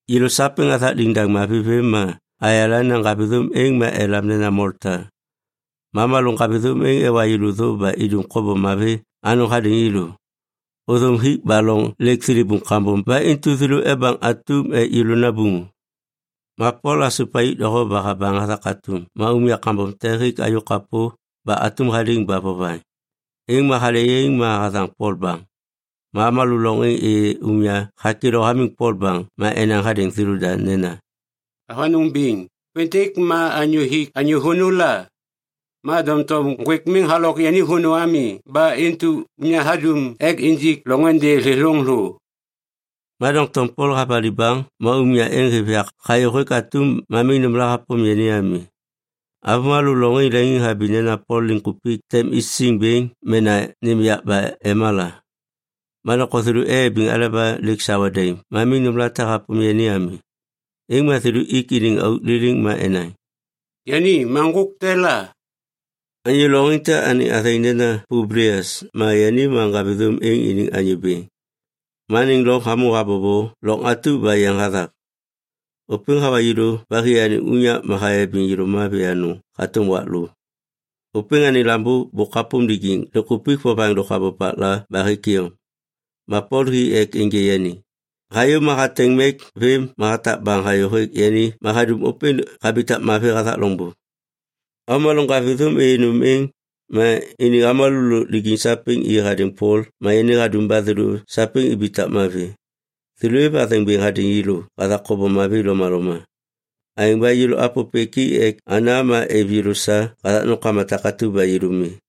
Yêlô sapêŋ athak liŋ mavi vêm ma ayala nena ŋgavithôm êŋ ma elam nena Molta. Ma avômalô ŋgavithôm êŋ ewa yêlô thô ba idum kobom mavi anôŋ hadêŋ yêlô. Ôthôm hik ba loŋ lêk thilibuŋ kambom ba intu thêlô ebaŋ atum ek yêlô nabuŋu. Ma Pol hasup ayôk doho ba habaŋ hathak atum ma umya kambom te hêk ayôk kapô ba atum haliŋ ba vovaŋ. Êŋ ma hale yaiŋ ma hathaŋ Pol baŋ. Ma avômalô loŋ êŋ êyê umya hakêlô hamiŋ Pol baŋ ma enaŋ hadêŋ thêlôda nena, “Avanôŋ biŋ, ôpêntêk ma anyô hik anyô vônô la. Ma doŋtom ŋgwêk miŋ halok yani vônô ami ba intu umya hadum ek injik loŋôndê thêthôŋ thô.” Ma doŋtom Pol havali baŋ ma umya êŋ hêv yak hayô hêk atum ma miŋ nômla hapôm yani ami. Avômalô loŋ êŋ leŋiŋhabi nena Pol liŋkupik tem isiŋ bêŋ mena nêm yak ba ema la. Ma doŋtom thêlô eyabiŋ aleba lêk sawa daim ma miŋ nômlate hapôm yani ami. Êŋ ma thêlô ik iniŋ auk liliŋ ma enaŋ, “Yani ma ŋgôk te la.” Anyô loŋ êŋ te anêŋ athêŋ nena Publias ma yani ma ŋgavithôm êŋ iniŋ anyô bêŋ. Ma anêŋ loŋ hamô habobo loŋ atu ba yeŋ hathak. Ôpêŋ hawa yêlô ba hi anêŋ unyak ma hayabiŋ yêlô mavi anôŋ hatôm wak lô. Ôpêŋ anêŋ lambô bôk hapôm lijiŋ liŋkupik vovaŋ lôk habopakla ba hêk iyom. Ma Pol hi ek ênjê yani. Hayô ma hateŋ mek vêm ma hatak baŋ hayô hêk yani ma hadum ôpêŋ habitak mavi hathak loŋbô. Avômalô ŋgavithôm êyê nôm êŋ, ma iniŋ avômalô lôk lijiŋ sapêŋ i hadêŋ Pol ma yani hadum ba thêlô sapêŋ ibitak mavi. Thêlô êv athêŋ bêŋ hadêŋ yêlô hathak kobom mavi lomaloma. Aêŋ ba yêlô apôpêk i ek ana ma êv yêlô sa hathak nômkama takatu ba yêlô mi.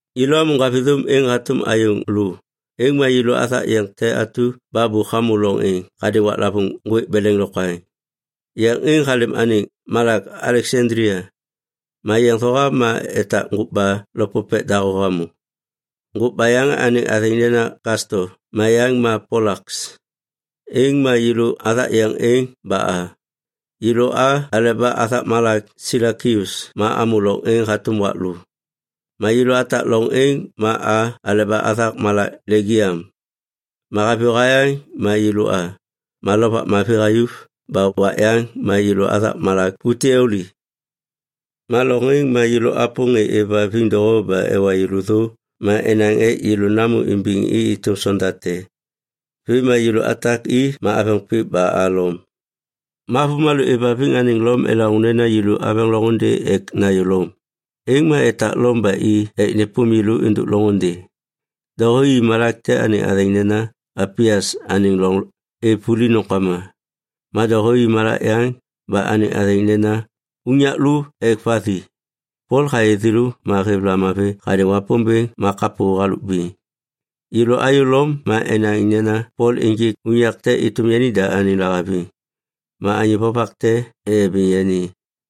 Yêlô amô ŋgavithôm êŋ hatôm ayôŋ lô, êŋ ma yêlô athak yeŋ te atu ba bôk hamô loŋ êŋ hadêŋ waklavôŋ ŋgwêk beleŋ lokwaŋ. Yeŋ êŋ halêm anêŋ malak Aleksandlia. Ma yeŋ thohav ma etak ŋgôkba lopopek dahô hamô, ŋgôkba yaŋ anêŋ athêŋ nena Kasto ma yaŋ ma Polaks. Êŋ ma yêlô athak yeŋ êŋ ba a. Yêlô a aleba athak malak Silakius ma amô loŋ êŋ hatôm wak lô. Ma yêlô atak loŋ êŋ ma a aleba athak malak Legiam. Ma haviyô hayaŋ ma yêlô a, ma lovak mavi hayuv ba wak yaŋ ma yêlô athak malak Puteoli. Ma loŋ êŋ ma yêlô apôm ŋê êvhaviŋ doho ba ewa yêlô thô ma enaŋ ek yêlô namô imbiŋ i êtôm sonda te. Vêm ma yêlô atak i ma aveŋ pik ba a Lom. Ma avômalô êvhaviŋ anêŋ Lom elaŋô nena yêlô aveŋ loŋôndê ek nayô Lom, êŋ ma etak Lom ba i ek nêpôm yêlô êndôk loŋôndê. Doho i malak te anêŋ athêŋ nena “Apias Anêŋ Loŋ Êv Vuli Nômkama”, ma doho i malak yaŋ ba anêŋ athêŋ nena “Unyak Lô Ek Vathi”. Pol hayê thêlô ma hêv lamavi hadêŋ Wapômbêŋ ma kapô halôk biŋ. Yêlô ayô Lom ma enaŋ nena Pol ênjêk unyak te êtôm yani da anêŋ lahaviŋ. Ma anyô vovak te eyabiŋ yani.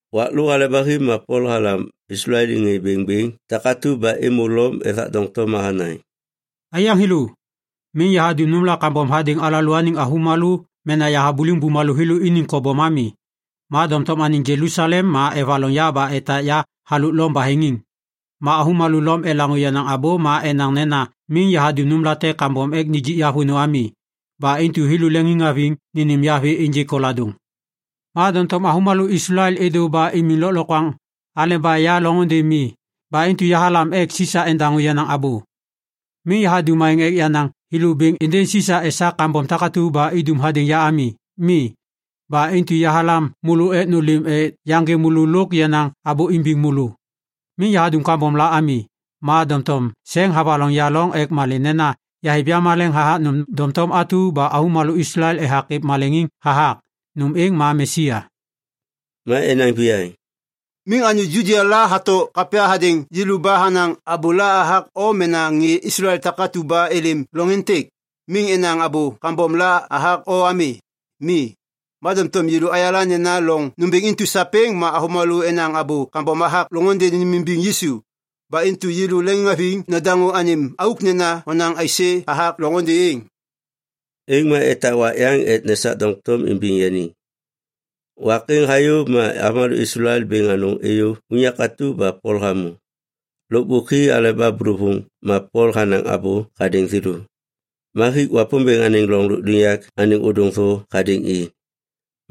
Wak lô hale ba hi ma Pol halam Islael iniŋ ŋê bêŋbêŋ takatu ba êmô Lom ethak doŋtom ma hanaŋ, “Aiyaŋ thêlô, miŋ yahadum nômla kambom hadêŋ alalôaniŋ avômalô mena yahabuliŋ bumalô thêlô iniŋ kobom ami. Ma doŋtom anêŋ Jelusalem ma evaloŋ ya ba etak ya halôk Lom baheŋiŋ. Ma avômalô Lom elaŋô yenaŋ abô ma enaŋ nena miŋ yahadum nômlate kambom ek nijik ya vônô ami. Ba intu thêlô leŋiŋhaviŋ nênêm ya vê ênjêk koladôŋ. Ma doŋtom avômalô Islael êdô ba imiŋ lôklokwaŋ aleba ya loŋôndê mi ba intu yahalam ek Sisa endaŋô yenaŋ abô. Miŋ yahadum aêŋ ek yanaŋ thêlô bêŋ êndêŋ Sisa esak kambom takatu ba idum hadêŋ ya ami. Mi. Ba intu yahalam môlô ek nôlêm ek yaŋgê môlô lôk yanaŋ abô imbiŋ môlô. Miŋ yahadum kambom la ami, ma doŋtom seŋ havaloŋ ya loŋ. Ek malê nena yahêv yamaleŋ hathak nôm doŋtom atu ba avômalô Islael ethak êv maleŋiŋ hathak. Nôm êŋ ma Mesia.” Ma enaŋ viyaŋ, “Miŋ anyô Judia la hato kapya hadêŋ yêlô ba hanaŋ abôla hathak o mena ŋê Islael takatu ba êlêm loŋ êntêk, miŋ enaŋ abô kambom la hathak o ami. Mi. Ma doŋtom yêlô ayala nena loŋ nômbêŋ intu sapêŋ ma avômalô enaŋ abô kambom hathak loŋôndê nênêmimbiŋ Yisu. Ba intu yêlô leŋiŋhaviŋ nadaŋô anêm auk nena honaŋ aisê hathak loŋôndê êŋ.” Êŋ ma etak wak yaŋ ek nesak doŋtom imbiŋ yani. Wak êŋ hayô ma avômalô Islael bêŋ anôŋ êyô unyak atu ba Pol hamô. Lôkbôk hi aleba bôlôvôŋ ma Pol hanaŋ abô hadêŋ thêlô. Ma hik Wapômbêŋ anêŋ loŋ lôkliŋyak anêŋ ôdôŋ thô hadêŋ i.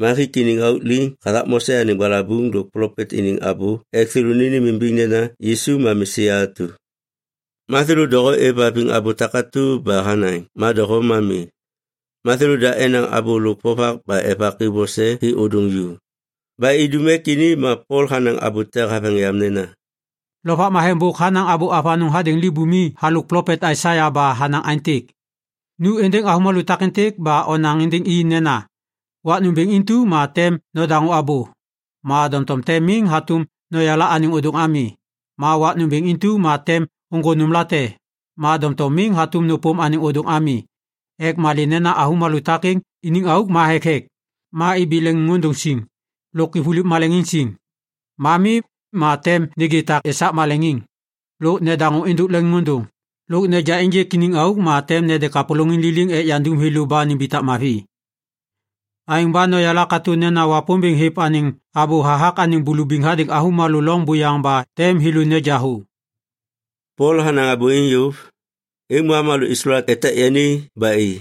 Ma hik iniŋ auk liŋ hathak Mose anêŋ balabuŋ lôk plopet iniŋ abô ek thêlô nênêmimbiŋ nena Yisu ma Mesia atu. Ma thêlô doho êvhaviŋ abô takatu ba hanaŋ ma doho ma mi. Ma thêlôda enaŋ abô lôk vovak ba evak i vose hi ôdôŋ ju. Ba idum ek ini ma Pol hanaŋ abô te haveŋ yam nena, “Lovak Matheŋ bôk hanaŋ abô avanôŋ hadêŋ libumi halôk plopet Aisaia ba hanaŋ aêntêk, “‘Nu êndêŋ avômalô takêntêk ba onaŋ êndêŋ i nena, “Wak nômbêŋ intu ma tem nodaŋô abô, ma doŋtom tem miŋ hatôm noyala anêŋ ôdôŋ ami; Ma wak nômbêŋ intu ma tem ôŋgô nômlate, ma doŋtom miŋ hatôm nôpôm anêŋ ôdôŋ ami.” Ek malê nena avômalô takêŋ iniŋ auk ma thekthek, ma ibi leŋiŋôndôŋ siŋ, lôk ivuliv maleŋiŋ siŋ. Ma mi, ma tem nêgê tak esak maleŋiŋ, lôk nedaŋô êndôk leŋiŋôndôŋ, lôk neja ênjêk iniŋ auk ma tem nede kapôlôŋiŋ liliŋ ek yandum thêlô ba nimbitak mavi.’ “Aêŋ ba noyala katô nena Wapômbêŋ hêv anêŋ abô hathak anêŋ bulubiŋ hadêŋ avômalô loŋ buyaŋ ba tem thêlô neja thô.” [Pol hanaŋ abô êŋ yôv, êŋ ma avômalô Islael etak yani ba i.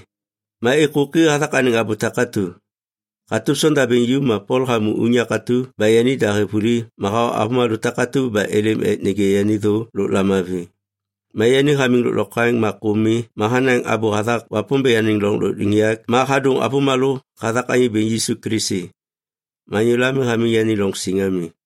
Ma êkôki hathak anêŋ abô takatu.] Hatôm sondabêŋ ju ma Pol hamô unyak atu ba yanida hêv vuli ma hawa avômalô takatu ba êlêm ek nêgê yani thô lôk lamavi. Ma yani hamiŋ lôklokwaŋ ma kô mi ma hanaŋ abô hathak Wapômbêŋ anêŋ loŋ lôkliŋyak ma hadôŋ avômalô hathak Anyô Bêŋ Yisu Kilisi. Ma anyôla miŋ hamiŋ yani loŋ siŋ ami.